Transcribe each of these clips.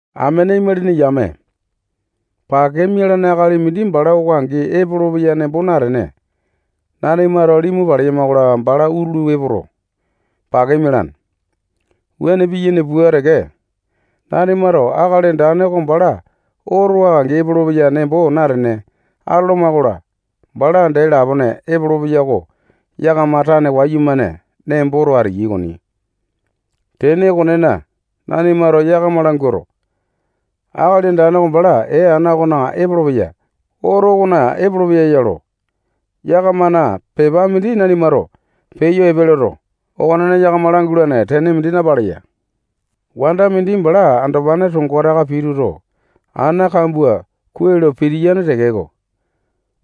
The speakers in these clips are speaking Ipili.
Amene imalini yame, pake mialane akali mindi bala oko angi epolopeya nembo natene, nanimato limu paleyama-kola, bala utulu epoto, pake mialane. Wuane piyaini pua teke, nanimato Akali Andane oko bala oko angi epolopeya nembo natene atoloma-kola, bala dee lapone epolopeya oko yakama tane wayumane nemboto ateyai okoni. Tene okonena, nanimato yakama languato, Akali Andane oko bala ee ana okona epolopeya, oto okona epolopeya lo, yakamana pepa mindi nanimato peyo epe loto, okonena yakama langulane tene mindi napaleya. Wanda mindi bala andopane tongo taka pituto, ana kambua kuai lo pitiyane tekeko,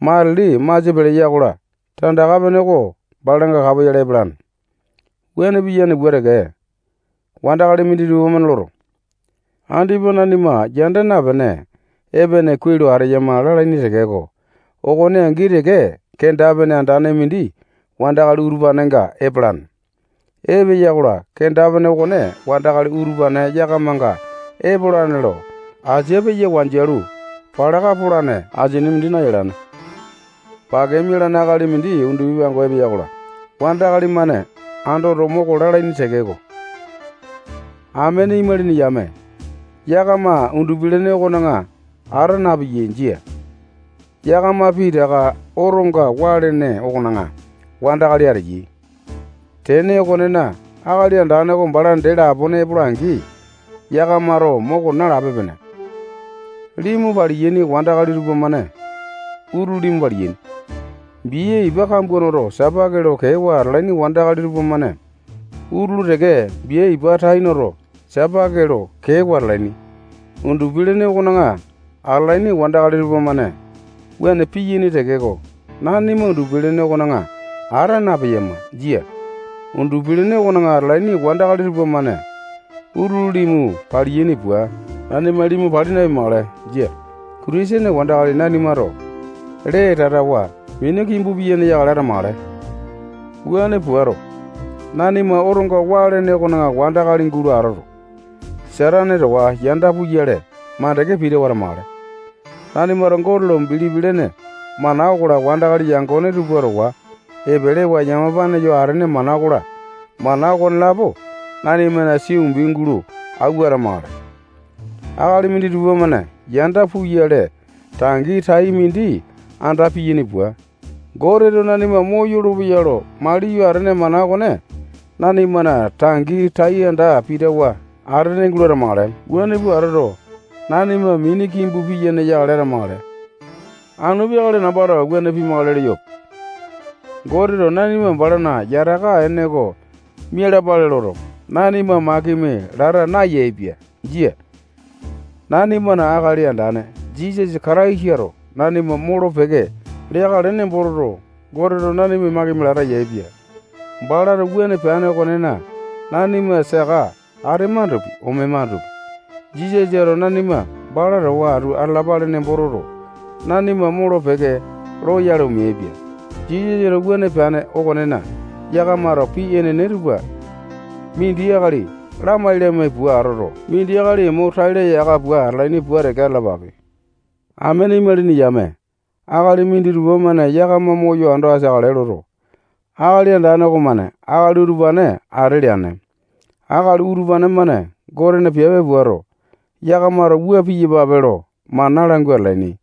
matili masia peleya-kola, tandaka pene oko balanga kapoyale epalane. Wuane piyane pua teke, wandakali minditupa-mane loto, andipa nanima yanda napene, epene kuai lo ateyama lalaini tekeko, okone angi teke kenda-pene andane mindi wandakali utupanenga epalane. Epeya-kola, kenda-pene okone wandakali utupane yakamanga epolane lo asia peyo wanjialu palaka polane asini mindi nayalane. Pake mialane akali mindi undupi pango epeya-kola, wandakali-mane andoto, moko lalaini tekeko, amene imalini yame, yakama undupi-lene okona ata napeyai. Jia. Yakama pitaka otonga waa lene okona wandakali ateyai. Tene okonena Akali Andane oko bala dee lapone epola-angi, yakamato moko nalape-pene. Limu paliyaini wandakali tupamane utulu limu paliyaini. Bia ipa kambua noto, sapake lo kewa atalaini wandakali tupamane utulu teke bia ipa tai noto, sapake lo kewa atalaini. Undupi-lene okona atalaini wandakali utupane-mane wuane piyaini tekeko, nanima undupi-lene okona ata napeyama. Jia. Undupi-lene okona atalaini wandakali tupamane utulu limu paliyaini pua, nanima limu pali napimakale. Jia. Kitisene wandakali nanimato lee tatawa mini kimbu piyene yakale atamakale. Wuane puato, nanima otonga waa lene okona wandakali gulo atoto, Satane towa yanda puyale makande pitawa atamakale. Nanimato Gote lo bilipi lene mana okola, wandakali yangone tupa towa epelewa yamapane yo atene mana okola, mana okonelapo nanimana sia umbi gulo awua atamakale. Akali minditupa-mane yanda puyale tangi tai mindi anda piyaini pua, Goteto nanima moyolo-peya lo maliyo atene mana okone nanimana tangi tai anda pitawa atamakale. Wuane pua atoto, nanima mini kimbu piyene yakale atamakale. Anu peakale nambato wuane pimakale leyope. Goteto nanima balana yataka ene oko mialapale loto, nanima makimi lata nayaepia. Jia. Nanimana Akali Andane Jisasa Kataisato nanima molo-peke leakale nembo toto, Goteto nanima makimi lata yaepia. Balato wuane peane okonena, nanima saka atemandopi, omemandopi, Jisasato nanima bala towa atu atalapale nembo toto, nanima molo-peke loyale omeaipia. Jisasato wuane peane okonena, yakamato pii epene tupa mindi akali lamai-lamai pua atoto, mindi akali mo tai laya aka pua atalaini pua teke atalapape. Amene imalini yame, akali minditupa-mane yakama moyo ando ateakale loto, Akali Andane okomane akali utupane ate leane. Akali utupane-mane Gotena piape puato, yakamato wua piyapape lo mana langua atalaini.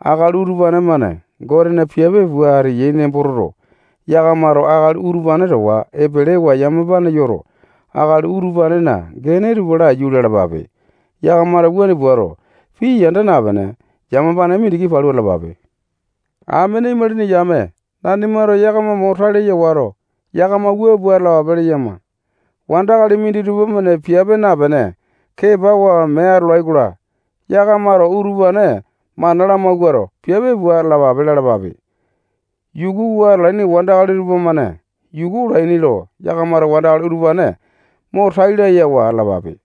Akali utupane-mane Gotena piape pua ateyai nembo toto, yakamato akali utupane towa epelewa yamapane yoto, akali utupanena gene tupa laiyu lalapape. Yakamato wuane puato, pii yanda napene, yamapane mindiki palu atalapape. Amene imalini yame, nanimato yakama mo tai laya wato, yakama wua pua atalapape leyama. Wandakali minditupa-mane piape napene, kepawa mee atolai-kola, yakamato utupane mana lamawuato, piape pua atalapape lalapape. Yukuwa atalaini wandakali tupamane yuku olaini lo, yakamato wandakali utupane mo tai layawa atalapape.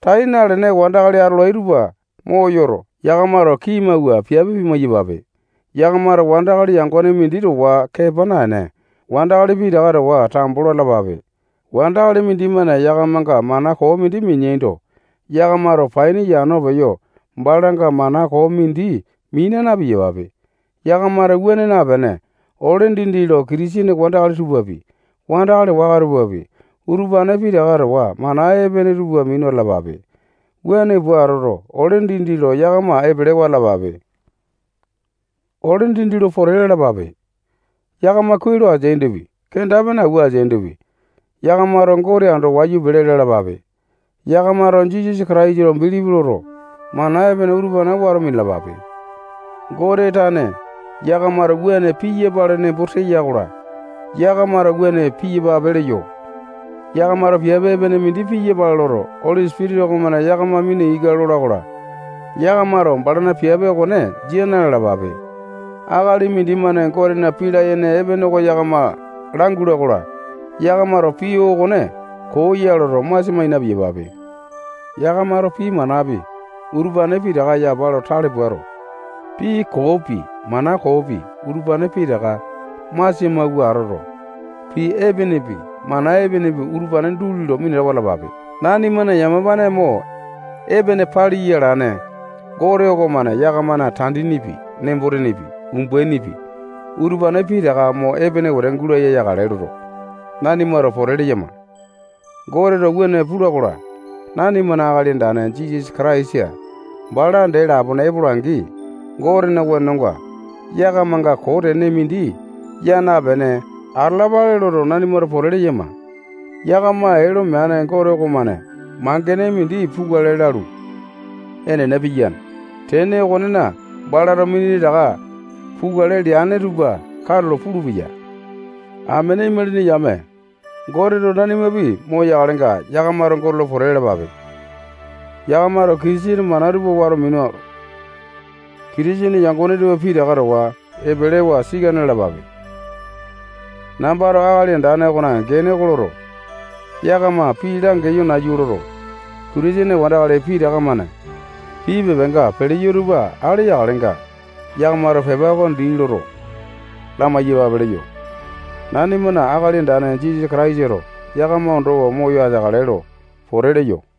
Tai nalene wandakali atolai tupa moyoto, yakamato kii mawua piape pimai-yapape. Yakamato wandakali yangone mindi towa kepa naene, wandakali pitaka towa tambo lo atalapape. Wandakali mindimane yakamanga mana koo mindi mineando, yakamato paini yano peyo balanga mana koo mindi mina na-piyapape. Yakamato wuane napene, ole dindi lo Kitisene wandakali tupapi, wandakali waka tupapi, utupane pitaka towa mana epene tupa minu atalapape. Wuane pua atoto, ole dindi lo yakama epelewa atalapape. Ole dindi lo pote lalapape. Yakama kuai lo ateaindopi, kenda-pene awua ateaindopi, yakamato Gote ando wayu pele lalapape. Yakamato Jisasa Kataisa lo bilipi loto, mana epene utupane wato minalapape. Gote tane yakamato wuane piyapale nembo teya-kola, yakamato wuane piyapape leyo. Yakamato piape epene mindi piyapale loto, Oli Sipitisa okomane yakama mina ika lola-kola, yakamato balana piape okone jia na-lalapape. Akali mindimane Gotena pii layene oko yakama langula-kola, yakamato pii okone koo ya loto, masia mai na-piyapape. Yakamato pii manapi, utupane pitaka yapa lo tale puato, pii koopi, mana koopi, utupane pitaka masia mawua atoto, pii epenepi, mana epenepi, utupane duli lo minatawa atalapape. Nanimana yamapane mo epene paliya alane Gote okomane yakamana tandinipi, nembo-tenepi, umbainipi, utupane pitaka mo epene wete gulaya yakale loto, nanimato pote leyama. Goteto wuane pula-kola, nanimana Akali Andane Jisasa Kataisa bala dee lapone epola-angi, Gotena wenonga yakamanga koo tene mindi yaa napene atalapale loto, nanimato pote leyama. Yakama ee lo meane Gote okomane mangene mindi pukale lalu, enene piyane. Tene okonena, balato minditaka pukale leane tupa katulo pulupeya. Amene imalini yame, Goteto nanimapi moyakalenga, yakamato Gote lo pote lalapape. Yakamato Kitisene mana tupa wato minuto, Kitisene yangone tupa pitaka towa epelewa sikane lalapape. Nambato Akali Andane okona gene oko loto, yakama pii langeyo nayu loto, Kitisene wandakali pitaka-mane pii pepanga peleyo utupa ale yakalenga, yakamato pepa oko dii loto, lamai-yapape leyo. Nanimana Akali Andane Jisasa Kataisato yakama ondowa moyo ateakale lo pote leyo.